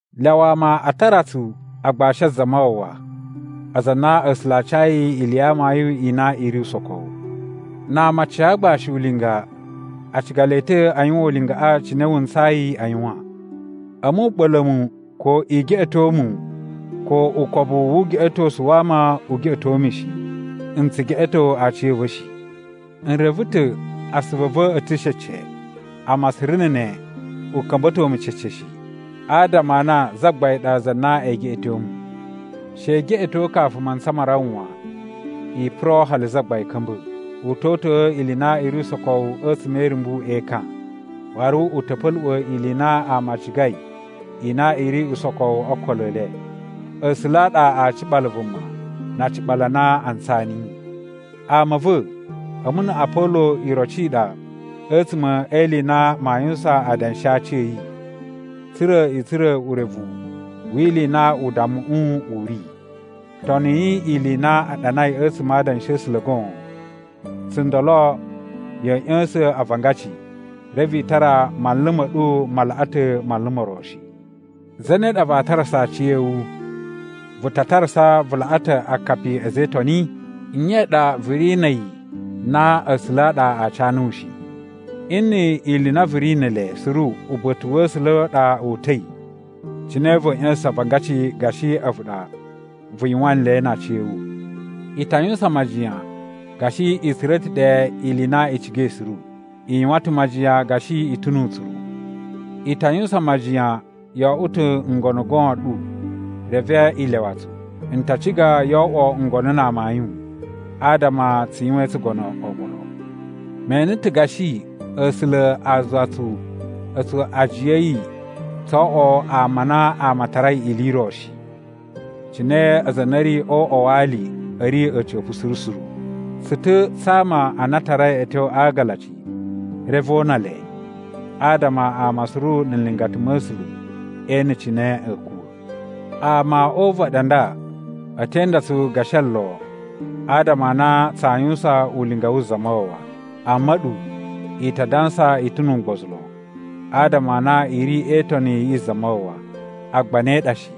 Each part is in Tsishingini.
Lyawa ama a tara tsu agbashi a Zamawawa, aza a na A̱sula̱ a cayi ili ya amayun i na i ri usokowu. Na ama a ca agbashi ulinga, a ciga le ta̱ a yuwan ulingaꞌa cine wuntsayi a yuwan. A̱mu u ɓa̱la̱ mu ko i geꞌeto mu ko ukobu wu ugeꞌetosu wa ama u geꞌeto mu shi. N tsu geꞌeto aciya̱va̱ shi. N reve ta̱ asuvu a̱ va̱ a̱ ta̱ cece. Amma suru na̱ ne u ka̱mba̱to mu cece shi, adama a na Zagbain ɗa za na ee geꞌeto mu. She i geꞌeto kafu mantsa ma rawa wan, i puro hali Zagbain ka̱mba̱. U to uta̱a̱ ili i na i ri usokowu a̱tsuma̱ e irumbu e ekan, waru u ta̱ pa̱luꞌwa̱ ili i na ama a cigai i na i ri usokowu o okolo e le. A̱sula̱ a ɗa aa ciɓala vuma na aciɓalu a na a ntsaa niyi. Ama a̱ va̱, a̱mu na̱ Apolo iroci i ɗa a̱tsuma̱ e ili i na maa yuwusan adanshi a aci a̱ yi, tsa̱ra̱ i tsura̱ urevu wi ili i na udammuꞌu u ri, “Toniyi ili i na a ɗanai a̱tsuma̱ a Adanshi a̱ A̱sula̱ goon.” Tsundolo ya̱a̱ ꞌya̱sa̱n avangaci reve i tara manlu ma̱ ɗu ma laꞌa ta̱ manlu mo ro shi. Zane ɗa vaa tarasa aciya̱wu? Vu ta tarasa vu laꞌa ta̱ akapi a̱ a̱za̱ e Itoni? Nye ɗa vu ri na̱ a̱yi na A̱sula̱ a ɗa a ca nuwu a̱yi shi? Nni ili i na vu ri ne ele suru uba̱ta̱ wa̱ A̱sula̱ a ɗa o uta̱i, cine va̱a̱ ꞌya̱sa̱sa̱n avangaci gashi a̱vu ɗa vu yuwan nle na aciya̱wu? I ta yuwusan majiyan gashi i tsura̱ ta̱ ɗe ili i na i cigai suru. I yuwan ta̱ majiyan gashi i ta̱ nu utsuru. I ta yuwusan majiyan yo oꞌwo ta̱ ngono goon ɗu reve i lyawa tsu. N ta ciga yo oꞌwo ngono na amayun adama tsu yuwain tsugono oɓolo. Me ene ta̱ gashi A̱sula̱ a zuwa tsu a̱tsu ajiya a̱ yi tso oꞌwo ama a na ama a tarai ili i ro shi, cine aza a na a̱ ri o uꞌwa wa ali a̱ ri a̱ca̱pa̱ suru suru. Tsu ta̱ tsa ama a na a tarai a̱ tyo a agalaci reve o una le, adama ama suru na̱ nlingata ma̱ A̱sula̱ e ene cine a̱a̱ kuwa̱. Ama o uvaɗi a nda a̱ te inda tsu gashi olo adama a na tsaa yuwusan ulinga wu Zamawawa. Amma a̱ɗu, i ta dansa i ta̱ nu ugbozu lon, adama a na i ri e itoni yi Zamawawa. Agba ne ɗa shi.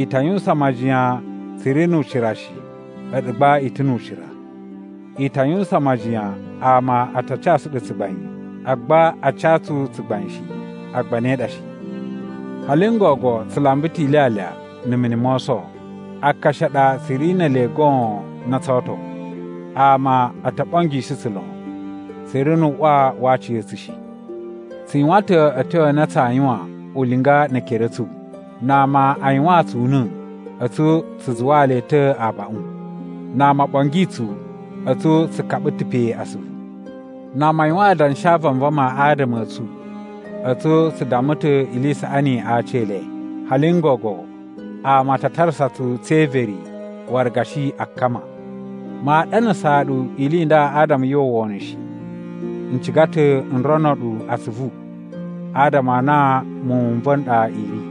I ta yuwusan majiyan tsu ri nu ucira shi a̱ɗu gba i ta̱ nu ucira. I ta yuwusan majiyan ama a ta casu ɗu tsugbain, agba a ca tsu tsugbain shi. Agba ne ɗa shi. Hali n gogo tsu lamba ta̱ ilyalya na̱ mini mo oso. Akashi a ɗa tsu ri ne ele goon na tsoo oto. Ama o to ɓongishi tsu lon. Tsu ri nu uꞌwa wa aciya̱tsu shi. Tsu yuwan ta̱ a̱tyo a na tsaa yuwan ulinga ne ekere a̱ tsu. Na ama a yuwaan tsu una̱, a̱tsu tsu zuwaa le ta̱ abaꞌun. Na ama o ɓongi tsu, a̱tsu tsu kaɓa ta̱ pe asuvu. Na ama a yuwan adanshi a vanvama adama a̱ tsu, a̱tsu tsu damma ta̱ ili i saꞌani a aci e le. Hali n gogo ama a ta tarasa tsu tse everi waru gashi akkama. Maa ɗanasaa ɗu ili i nda adama yu uwwa wono shi. N ciga ta̱ n rono ɗu atsuvu adama a na muwun n va̱ n ɗa i ri.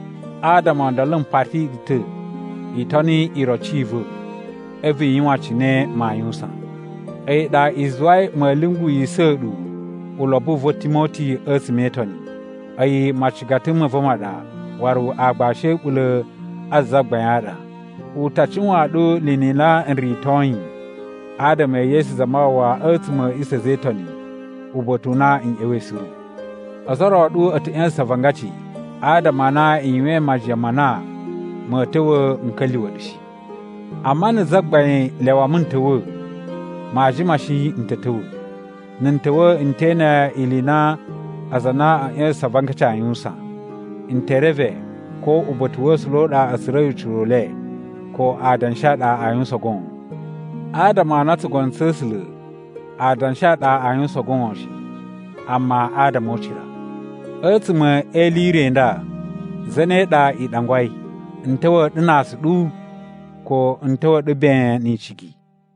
Adama o ndolo m pati ɗu ta̱ i toni iroci i va̱ a̱vu i yuwan cine maa yuwusan. A̱yi ɗa i zuwai ma̱a̱ lyunguwisa̱ ɗu ulobo u va̱ Timoti a̱tsuma̱ e itoni. A̱yi macigata ma̱ va̱ ma ɗa waru aagbashi a̱ a̱ɓula̱ a Zagbain a ɗa. U ta cuwaan ɗu ni ili i na n ritoi adama e Yesu Zamawawa a̱tsuma̱ a̱ a̱ꞌisa̱ a̱ a̱za̱ e Itoni uba̱ta̱ u na n ꞌya̱wa̱i suru. Ozo o ro a̱ ɗu a̱ ta̱ ꞌya̱sa̱sa̱n avangaci adama a na i yuwain majiyan ma na ma̱a̱ ta̱wa̱ n ka̱lyuwa̱ ɗu shi. Amma na̱ Zagbain lyawa mu n ta̱wa̱, maa jima shi n ta̱ ta̱wa̱. Na̱ n ta̱wa̱ n te ene ili i na aza a na a̱a̱ ꞌya̱sa̱sa̱n avangaci aa yuwusan. N te reve ko uba̱ta̱ wa̱ A̱sula̱ u ɗa a̱ tsura̱i ucira u le, ko adanshi a ɗa aa yuwusan goon. Adama a na tsugono tsa̱ A̱sula̱ adanshi a ɗa a yuwusan goon shi, amma adama o ucira. A̱tsuma̱ e ili i re i nda, zane ɗa i ɗangwai: n ta̱wa̱ ɗu na aasuɗu ko n ta̱wa̱ ɗu ben ni icigi?